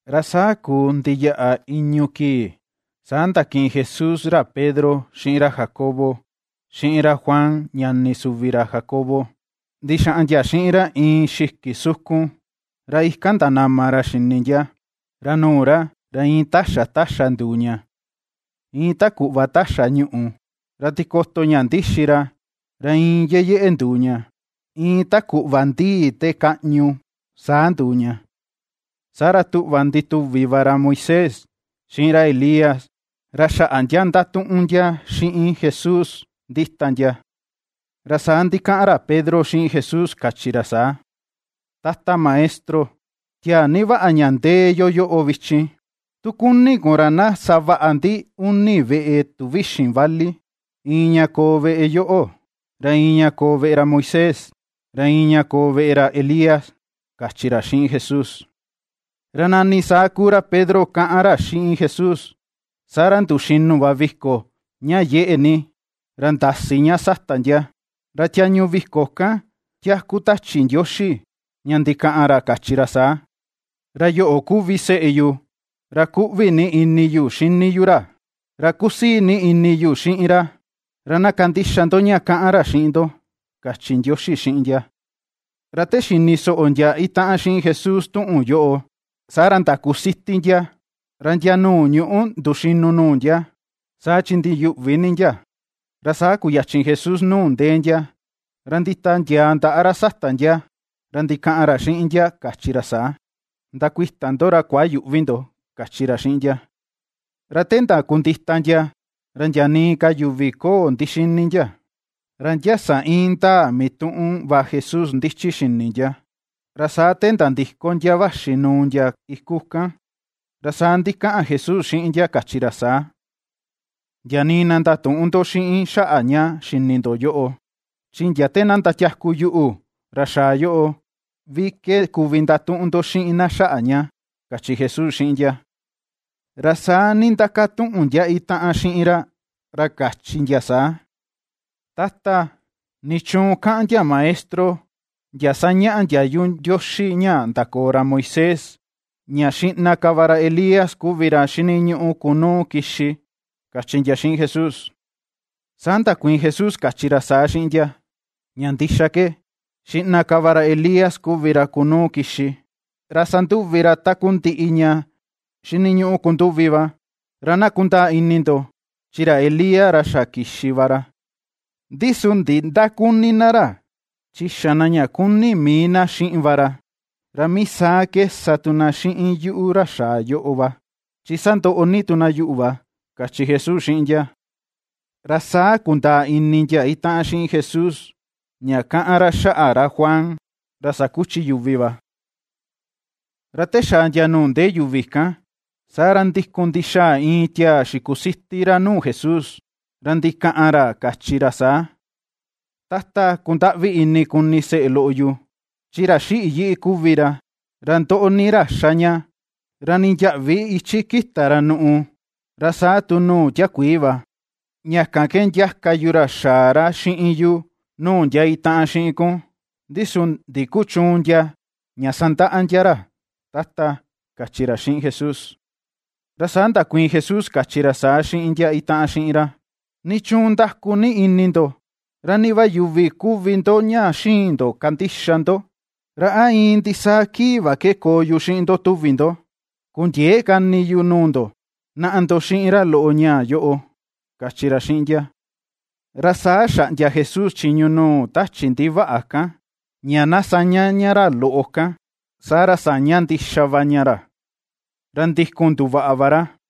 Ra saa kuu ndiyaꞌa i̱ñu̱ kii, saa ndakiꞌin Jesús ra Pedro, xiꞌin ra Jacobo, xiꞌin ra Juan ñani suvi ra Jacobo, ndixaꞌan ndia xiꞌin ra iin xiki sukun. Ra ikan ndanama ra xini ndia; ra nuu ra, ra iin taxa taxa nduu ña, iin ta kuꞌva taxa ñuꞌu, ra tikoto ña ndixi ra, ra iin yeyeꞌe nduu ña, iin ta kuꞌva ndii te kaꞌñu saa nduu ña. Saa ra tuꞌva ndituvi va ra Moisés, xiꞌin ra Elías, ra xaꞌa ndia ndatuꞌun ndia xiꞌin Jesús ndita ndia. Ra saa ndikaꞌan ra Pedro xiꞌin Jesús kachi ra saa: ―Tata Maestro, tiaa ni vaꞌa ña ndee yo yoꞌo vichin. Tu kuni kun ra na savaꞌa ndi uni veꞌe tuvíxi̱n vali: iin ña koo veꞌe yoꞌo, ra iin ña koo veꞌe ra Moisés, ra iin ña koo veꞌe ra Elías ―kachi ra xiꞌin Jesús. Ra nani saa kuu ra Pedro kaꞌan ra xiꞌin Jesús, saa ra nduxinu va viko ña yeꞌe ni ra ndasi ña sata ndia; ra tiañu viko kan tiaku tachi Ndioxi ña ndikaꞌan ra kachi ra saa: ―Ra yoꞌo kuvi seꞌe yu, ra kuꞌvi ni ini yu xini yu ra, ra kusii ni ini yu xiꞌin ra, ra na kandixa ndo ña kaꞌan ra xiꞌin ndo ―kachi Ndioxi xiꞌin ndia. Ra te xini soꞌo ndia itaꞌan xiꞌin Jesús tuꞌun yoꞌo, saa ra ndakusiti ndia, ra ndia nuu ñuꞌu nduxinu nuu ndia, saa chi ndiyuꞌvi ni ndia. Ra saa kuyachi Jesús nuu ndee ndia, ra nditiandiaa ndaꞌa ra sata ndia, ra ndikaꞌan ra xiꞌin ndia kachi ra saa: ―Ndakuita ndo ra kuayüꞌvi ndo ―kachi ra xiꞌin ndia. Ra te ndakundita ndia, ra ndia nii ka yuvi köo ndixini ndia, ra ndia sa indaa mituꞌun va Jesús ndichi xini ndia. Ra saa te nandiko ndia vaxi nuu ndia iku kan, ra saa ndikaꞌan Jesús xiꞌin ndia kachi ra saa: ―Ndia nii na ndatüꞌun ndo xiꞌin xaꞌa ña xini ndo yoꞌo, chi ndia te na ndatiaku yuꞌu, ra xaa yoꞌo, vi ke kuvi ndatuꞌun ndo xiꞌin na xaꞌa ña ―kachi Jesús xiꞌin ndia. Ra saa nindakatuꞌun ndia itaꞌan xiꞌin ra ra kachi ndia saa: ―Tata, ¿nichuun kaꞌan ndia maestro ndia sañaꞌa ndiayu Ndioxi ña ndakoo ra Moisés, ña xiꞌna ka va ra Elías kuvi ra xiniñuꞌu kunuu kixi? ―kachi ndia xiꞌin Jesús. Saa ndakuiin Jesús kachi ra saa xiꞌin ndia: ―Ña ndixa ke, xiꞌna ka va ra Elías kuvi ra kunuu kixi, ra sanduvi ra takundiꞌi ña xiniñuꞌu kunduvi va. Ra na kundaa ini ndo, chi ra Elías, ra xa kixi va ra, ndi su ndindaküni na ra, chi xa na ña kuni mii na xiꞌin va ra. Ra mii saa ke sa tu na xiꞌin yuꞌu ra xaa yoꞌo va, chi sandoꞌo ni tu na yuꞌu va ―kachi Jesús xiꞌin ndia. Ra saa kundaa ini ndia itaꞌan xiꞌin Jesús, ña kaꞌan ra xaꞌa ra Juan ra sakuchi yuvi va. Ra te xaa ndia nuu ndee yuvi kan, saa ra ndikun ndixaa iin tiaa xikusiti ra nuu Jesús, ra ndikaꞌan ra kachi ra saa: ―Tata, kundaꞌvi ini kuni seꞌe loꞌo yu, chi ra xiꞌi yiꞌi kuvi ra, ra ndoꞌo ni ra xa ña; ra nii ndiäꞌvi ichi ^kita ra nuꞌu, ra saa tu nuu tiakuii va. Ña kan ke ndiaka yu ra xaa ra xiꞌin yu nuu ndia itaꞌan xiꞌin kun, ndi su ndikuchüun ndia ña sandaꞌa ndia ra, Tata ―kachi ra xiꞌin Jesús. Ra saa ndakuiin Jesús kachi ra saa xiꞌin ndia itaꞌan xiꞌin ra: ―¿Nichuun ndaku ni ini ndo? ¿Ra ni va yuvi kuvi ndo ña xïin ndo kandixa ndo? ¿Ra a iin ndisaa kii va ke koo yu xiꞌin ndo tuvi ndo? Kundiëe ka ini yu nuu ndo. Naꞌa ndo xiꞌin ra loꞌo ñaa yoꞌo ―kachi ra xiꞌin ndia. Ra saa xaꞌndia Jesús chiñu nuu tachi ndivaꞌa kan, ña na ^saña ña ra loꞌo kan, saa ra saña ndixa va ña ra, ra ndikun nduvaꞌa va ra.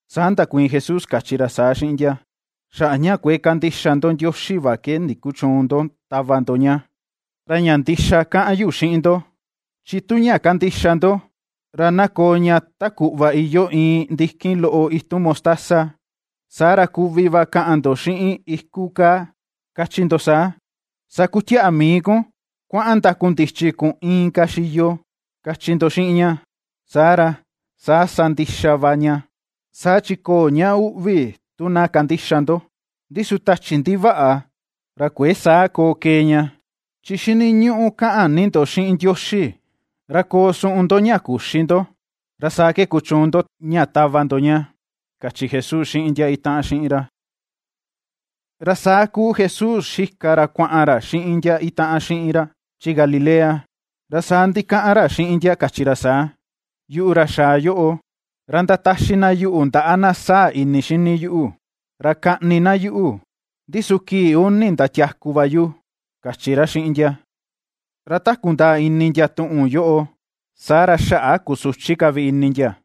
Saa ndakuiin Jesús kachi ra saa xiꞌin ndia. ―Xaꞌa ña kuëe kandixa ndo Ndioxi va ke ndikuchüun ndo tava ndo ña. Ra ña ndixa kaꞌan yu xiꞌin ndo, chi tu ña kandixa ndo ra na koo ña ta kuꞌva iyoo iin ndikin loꞌo itun mostaza, saa ra kuvi va kaꞌan ndo xiꞌin iku kaa, kachi ndo saa: “Sakutiaꞌa mii kun, ra kuaꞌan ndakundichi kun inka xiyo”, kachi ndo xiꞌin ña, saa ra, saa sa ndixa va ña. Saa chi köo ña uꞌvi tu na kandixa ndo. Ndi su tachi ndivaꞌa, ra kuëe saa koo kee ña, chi xiniñuꞌu kaꞌan ni ndo xiꞌin Ndioxi, ra koo suꞌun ndo ña küxi ndo, ra saa ke kuchuun ndo ña tava ndo ña ―kachi Jesús xiꞌin ndia itaꞌan xiꞌin ra. Ra saa kuu Jesús xika ra kuaꞌan ra xiꞌin ndia itaꞌan xiꞌin ra chi Galilea, ra saa ndikaꞌan ra xiꞌin ndia kachi ra saa: ―Yuꞌu ra xaa yoꞌo, ra ndataxi na yuꞌu ndaꞌa na sáa̱̱ ini xini yuꞌu. Ra kaꞌni na yuꞌu, ndi su kii uni ndatiaku va yu ―kachi ra xiꞌin ndia. Ra ta kundaa ini ndia tuꞌun yoꞌo saa ra xaꞌa kusuchi ka vi ini ndia.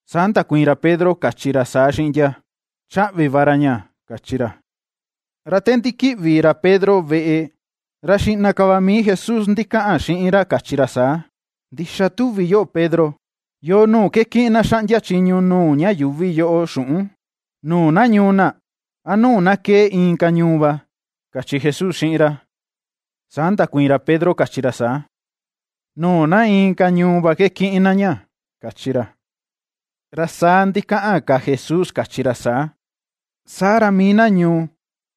Saa ndakuiin ra Pedro kachi ra saa xiꞌin ndia: ―Chaꞌvi va ra ña ―kachi ra. Ra te ndikiꞌvi ra Pedro veꞌe, ra xiꞌna ka va mii Jesús ndikaꞌan xiꞌin ra kachi ra saa: ―¿Ndixa tuvi yoꞌo, Pedro? ¿Yoo nuu ke kiꞌin na xaꞌndia chiñu nuu ña yuuvi yoꞌo xuꞌun: nuu na ñuu na, a nuu na kee inka ñuu va? ―kachi Jesús xiꞌin ra. Saa ndakuiin ra Pedro kachi ra saa: ―Nuu na inka ñuu va ke kiꞌin na ña ―kachi ra. Ra saa ndikaꞌan ka Jesús kachi ra saa: ―Saa ra, mii na ñuu,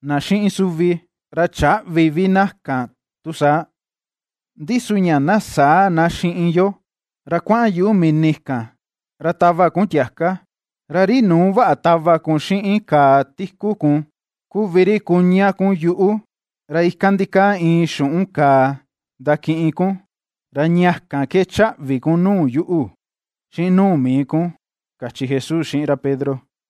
na xiꞌin suvi, ra chäꞌvi vi na kan tu saa. Ndi su ña na säa na xiꞌin yo, ra kuaꞌan yuꞌu mini kan ra tava kun tiaka, ra ri nuu vaꞌa tava kun xiꞌin kàà tiku kun kuvi ri kuña kun yuꞌu, ra ikan ndikaa iin xuꞌun kàà ndakiꞌin kun, ra ña kan ke chaꞌvi kun nuu yuꞌu xiꞌin nuu mii kun ―kachi Jesús xiꞌin ra Pedro.